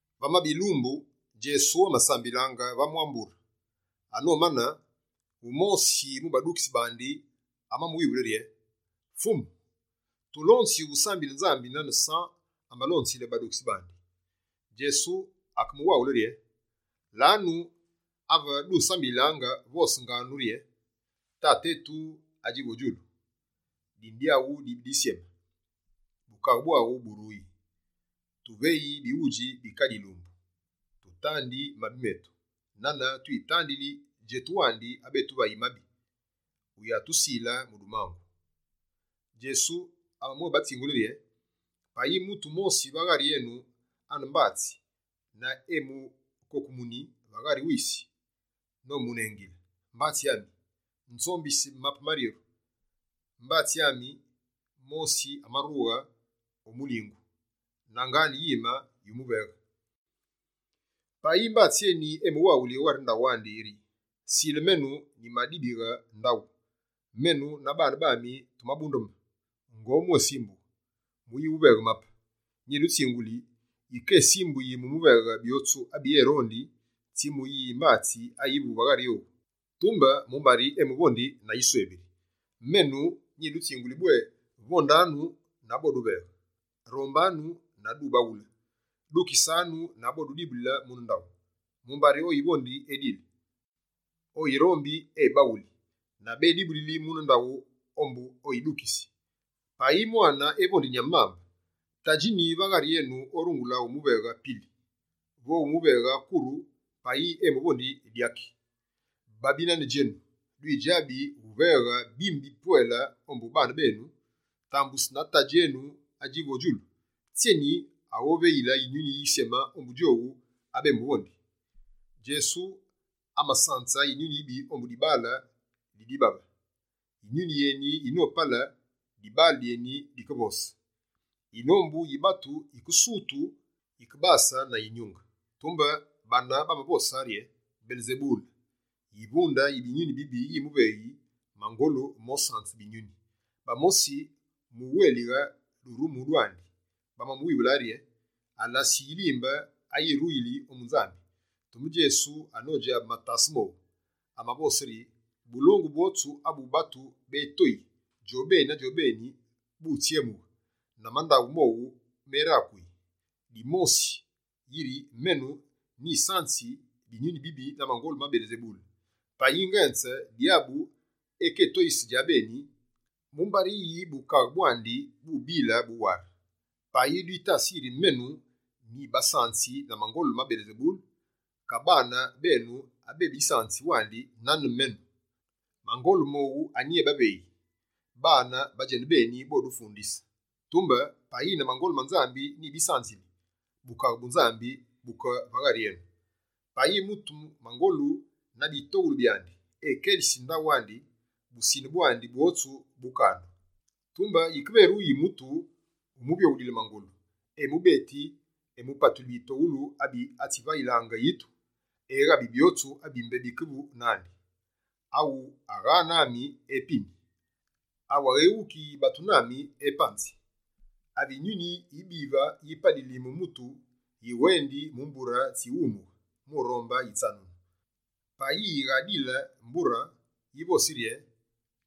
Vamabe yilumbu, Djesu amasambilaange va mwa mbure. Anomane, wumosi mu badukitsi bandi amamuwivule rye: «Fumu, tulonzi wusambile Nzambi nane San amalonzile badukitsi bandi.» Djesu akebawaghule rye: «Lanu, ave dusambililaange, vosanganu rye: “Tate etu, adjivu o djulu, dine dyaghu dibi disyeme, bukaghe bwaghu buruyi. Tuveyi bighudji bi kadi yilumbu. Tutandi mabi metu, nane twitandili djetu wandi abetuvayi mabi, wuyatusile mu dumangu.”» Djesu amamwébatsingule rye: «Payi mutu wumosi va ghari enu ane mbatsi, na eyimukokumune va ghari wisi, nomunengile: “Mbatsi ami, nzombisi mape maryeru, mbatsi ami mosi amarughe o wulinge, na ngaane yime yumuveghe.” Ka yike mbatsi eni emuwaghuli o ghari ndaghu andi rye: “Sile menu, nyimadibighe ndaghu, menu na baane bami tumabundeme, ngobwésimbughe muyighuveghe mape.” Nyidutsinguli, yike esimbuyi mu muveghe byotsu abi erondi, tsi mu yimbatsi ayivu va ghari owu, tumbe mumbari emuvondi na yiswebiri. Menu, nyidutsinguli bwé: Vondanu, na boduveghe; rombanu, na dubaghule; dukisanu na bodudibulile mune ndaghu. Mumbari, oyivondi, edili; oyirombi, ebaghuli; na bédibulili mune ndaghu ombu oyidukisi. Payi mwane evondi nyame mambe, tadji nyi va ghari enu orungule umuveghe pili? Vo omuveghe kuru payi emuvondi dyaki? Babi nane djenu dwidjabi uveghe bime bi bwedji ombu baane benu, tambusu na Tadji enu adjivu o djulu, tsyeni aghoveyile Yinyuni Yisyeme ombu djowu abemuvondi?» Djesu amasanze Yinyuni yibi ombu dibaale di dibabe. Yinyuni yeni yinopale, dibaale dyeni dikevose. Yinombu yi batu yikesutu yikebase na yinyunge. Tumbe bane bamavose rye: «Belesebule, yivunde yi binyuni bibi yimuveyi mangolu mosanze binyuni!» Bamosi, mu wélighe durumu dwandi, bamamuwivule yiri alasi yilimbe ayiruyili ombu Nzambi. Tumbe Djesu anodjabe matase mowu, amavose rye: «Bulongu bwotsu abu batu bétoyi djobeni na djobeni, butsyemughe, na mandaghu mowu merakuyi. Dwivosi yiri menu nyisanzi binyuni bibi na mangolu ma Belesebule. Payi ngenze Dyabu ekétoyise djabeni, mumbari yi bukaghe bwandi bubile buware? Payi dwitasi yiri menu, nyibisanzi na mangolu ma Belesebule, ka baane benu abebisanzi wandi nane menu, mangolu mowu anyi ebaveyi? Baane ba djenubeni bodufundise! Tumbe, payi na mangolu ma Nzambi nyibisanzili, Bukaghe bu Nzambi buke va ghari enu. Payi mutu mangolu na bitoghulu byandi, ekelisi ndaghu andi, busine bwandi bwotsu bukandu. Tumbe yikeveruyi mutu wumuvyoghulile mangolu, emubeti, emupatuli bitoghulu abi atsivayilaange yitu, eghabi byotsu abi mbé bikevu nandi. Awu agha nami, epini. Awu aghéghukiyi batu nami, epanzi.» «Ave Yinyuni yibive yipalili mu mutu, yiwendi mu mbure tsi wumughe mu rombe yitsanunu. Payi yighaayidile, yivosi rye: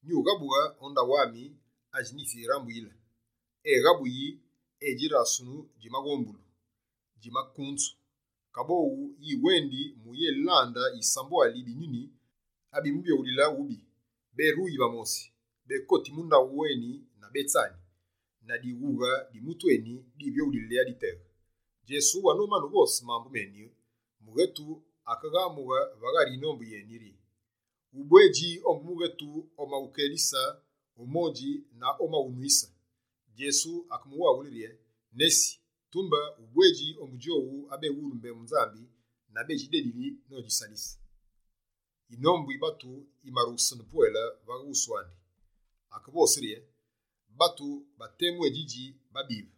“Nyughabughe o ndaghu ami adji nyitsirambuyile.” Eghabuyi, edjirasunu djimaghombulu, djimakunzu. Kaboghu yiwendi muyélande yisambwali yi binyuni abimuvyoghulile wubi. Béruyi va mosi, békoti mu ndaghu eni na bétsani. Na dighughe di mutu eni divyoghulili aditeghe.» Djesu anomane uvose mambu meni, mughetu akeghamughe va ghari yinombu rye: «Ubwedji ombu mughetu omaghukelise o modji na omaghunwise!» Djesu akemuwaghule rye: «Nesi, tumbe ubwedji ombu djowu abewulu mbembu Nzambi na bédjidedili nodjisalise!» Yinombu yi batu yimarughesene pwele va wusu andi, akevose rye: «Batu ba temu édjidji babive,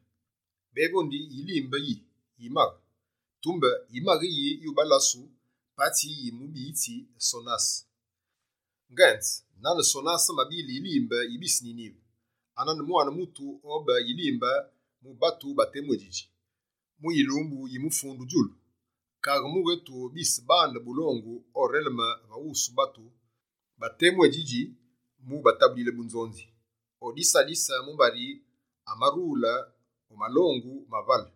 bévondi yilimbe yi yimaghe, tumbe yimaghe yi yubalasu, patsi yi mubiyitsi Sonase? Ngenze nane Sonase amabile yilimbe yi bise Ninive, anane Mwane Mutu obe yilimbe mu batu ba temu édjidji. Mu yilumbu yi mufundu djulu, kaghe mughetu bise bande bulongu oreleme va wusu batu ba temu eni djidji, mu ubatabulile bunzonzi. Odisalise mumbari amarule o malongu ma vale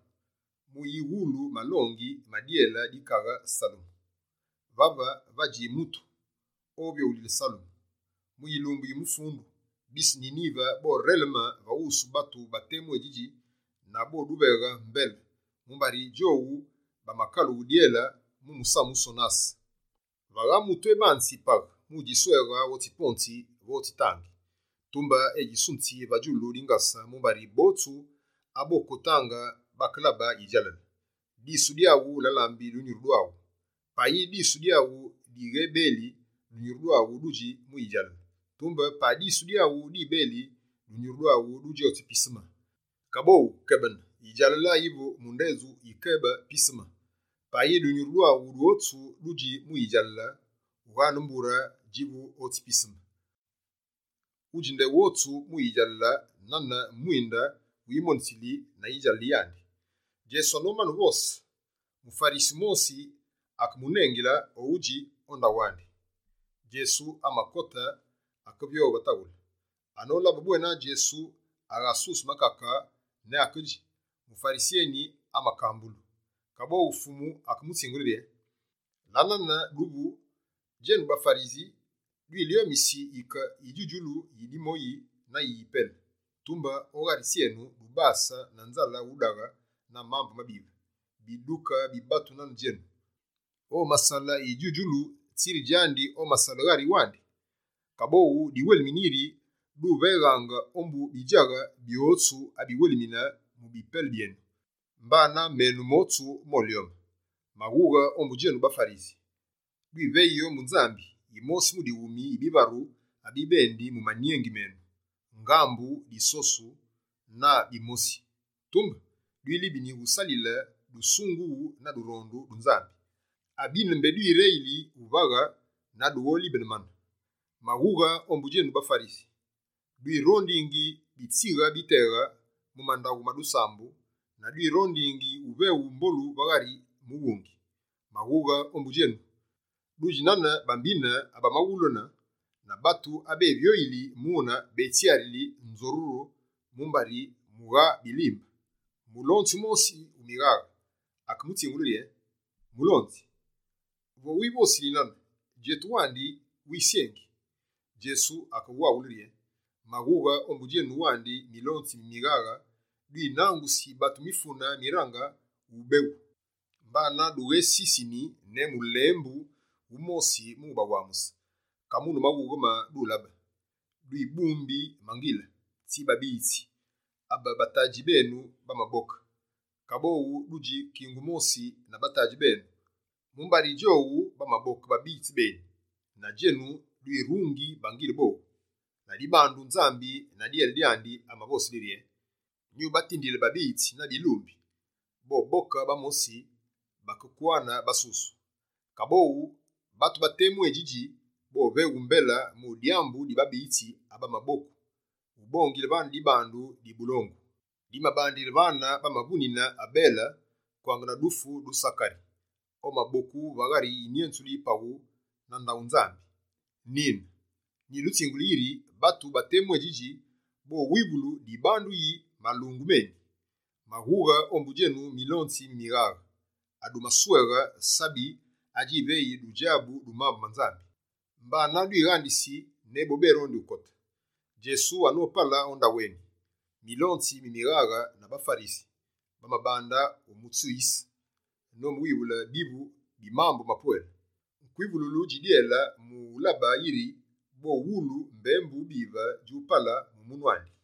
mu uyiwulu malongi ma dyele di kaghe Salemu. Vave, vadji Mutu avyoghulile Salemu! Mu yilumbu yi mufundu, bise Ninive boreleme va wusu batu ba temu eni djidji na boduveghe mbele, mumbari djowu bamakalughe dyele mu musamu Sonase!» «Vagha mutu ebanzi paghe mu udjisweghe otsi ponzi vo otsi tangi, tumbe edjisunzi va djulu dingase mumbari botsu abokotaange bakelaba yidjalale. Disu dyaghu la lambi dunyuru dwaghu. Payi disu dyaghu dighebeli, dunyuru dwaghu dudji mu yidjalale. Tumbe payi disu dyaghu dibeli, dunyuru dwaghu dudji otsi piseme. Kaboghu kebene, yidjalale ayivu mu ndedju yikebe piseme. Payi dunyuru dwaghu dwotsu dudji mu yidjalale, ughaane mbure djivu otsi piseme, udji ndedju wotsu mu yidjalale, nane mwinde wighumonitsili na yidjalale yandi.» Djesu anomane uvose, muFarisi wumosi akemunengile o udji o ndaghu andi. Djesu amakote akevyoghe va tavule. Anolabe bwena Djesu aghasuse makake ne akedji, muFarisi eni amakambulu. Kaboghu Fumu akemutsingule rye: «La nane duvu, djenu baFarisi, dwilyomisi yike yidju-djulu yi dimoyi na yi yipele, tumbe o ghari tsyenu, dubase na nzale udaghe na mambu mabive. Biduke bi batu nane djenu! Omasale yidju-djulu, tsiri djandi amasale ghari wandi? Kaboghu, diwelimine yiri duveghaange ombu bidjaghe byotsu abiwelimine mu bipele byenu, mbana menu motsu molyome. Maghughe ombu djenu baFarisi dwiveyi ombu Nzambi yimosi mu dighumi yi bivaru abibendi mu manyengi menu: ngambu, disosu na bimosi. Tumbe dwilibini usalise dusungughu na durondu du Nzambi. Abine mbé dwireli uvaghe na dugholibene mane. Maghughe ombu djenu baFarisi, dwirondingi bitsighe biteghe mu mandaghu ma dusambu, na dwirondingi uveghu mbolu va ghari mughungi. Maghughe ombu djenu, dudji nane bambine bamaghulene, na batu ave bévyoyili mune bétsyarile nzoruru mumbari mughaa bilimbe!» Mulonzi wumosi wu mighaghe akemutsingule rye: «Mulonzi, vo wivosili nane, djetu wandi wisyengi!» Djesu akewaghule: «Maghughe ombu djenu wandi milonzi mi mighaghe, dwinangusi batu mifune mirange ubeghu, mbana dughesisini ne mulembu wumosi mu ubawamuse. Kamune maghughe ma dulabe? Dwibumbi bangile tsi babiyitsi, abe batadji benu bamaboke. Kaboghu, dudji kingu mosi na batadji benu, mumbari djowu bamaboke babiyitsi beni, na djenu dwirungi bangile bowu. Ladibandu, Nzambi na dyele dyandi amavosile rye: “Nyubatindile babiyitsi na bilumbi, boboke bamosi, bakekwane basusu.” Kaboghu, batu ba temu eni djidji, boveghu mbele mu dyambu di babiyitsi abamaboku, ubongile vane dibandu di bulongu. Dimabandile vane bamavunine Abele kwange na dufu du Sakari, omaboku va ghari yinyenzulu yi paghu na ndaghu Nzambi. Nine, nyidutsinguli yiri, batu ba temu eni djidji, bowivulu dibandu di malungu meni! Maghughe ombu djenu milonzi mi mighaghe, adumasweghe sabi adjiveyi dudjabu du mambu ma Nzambi. Dughadukote djenubeni, mbana dwighandise ne bo mbé baronde ukote.» Djesu anopale o ndaghu eni, Milonzi mi mighaghe na baFarisi, bamabande wumutsuyise nomuwivule bivu mu mambu mapwele, kwivululu dji dyele mu ulabe yiri bowulu mbembu bive djupale mu munu andi.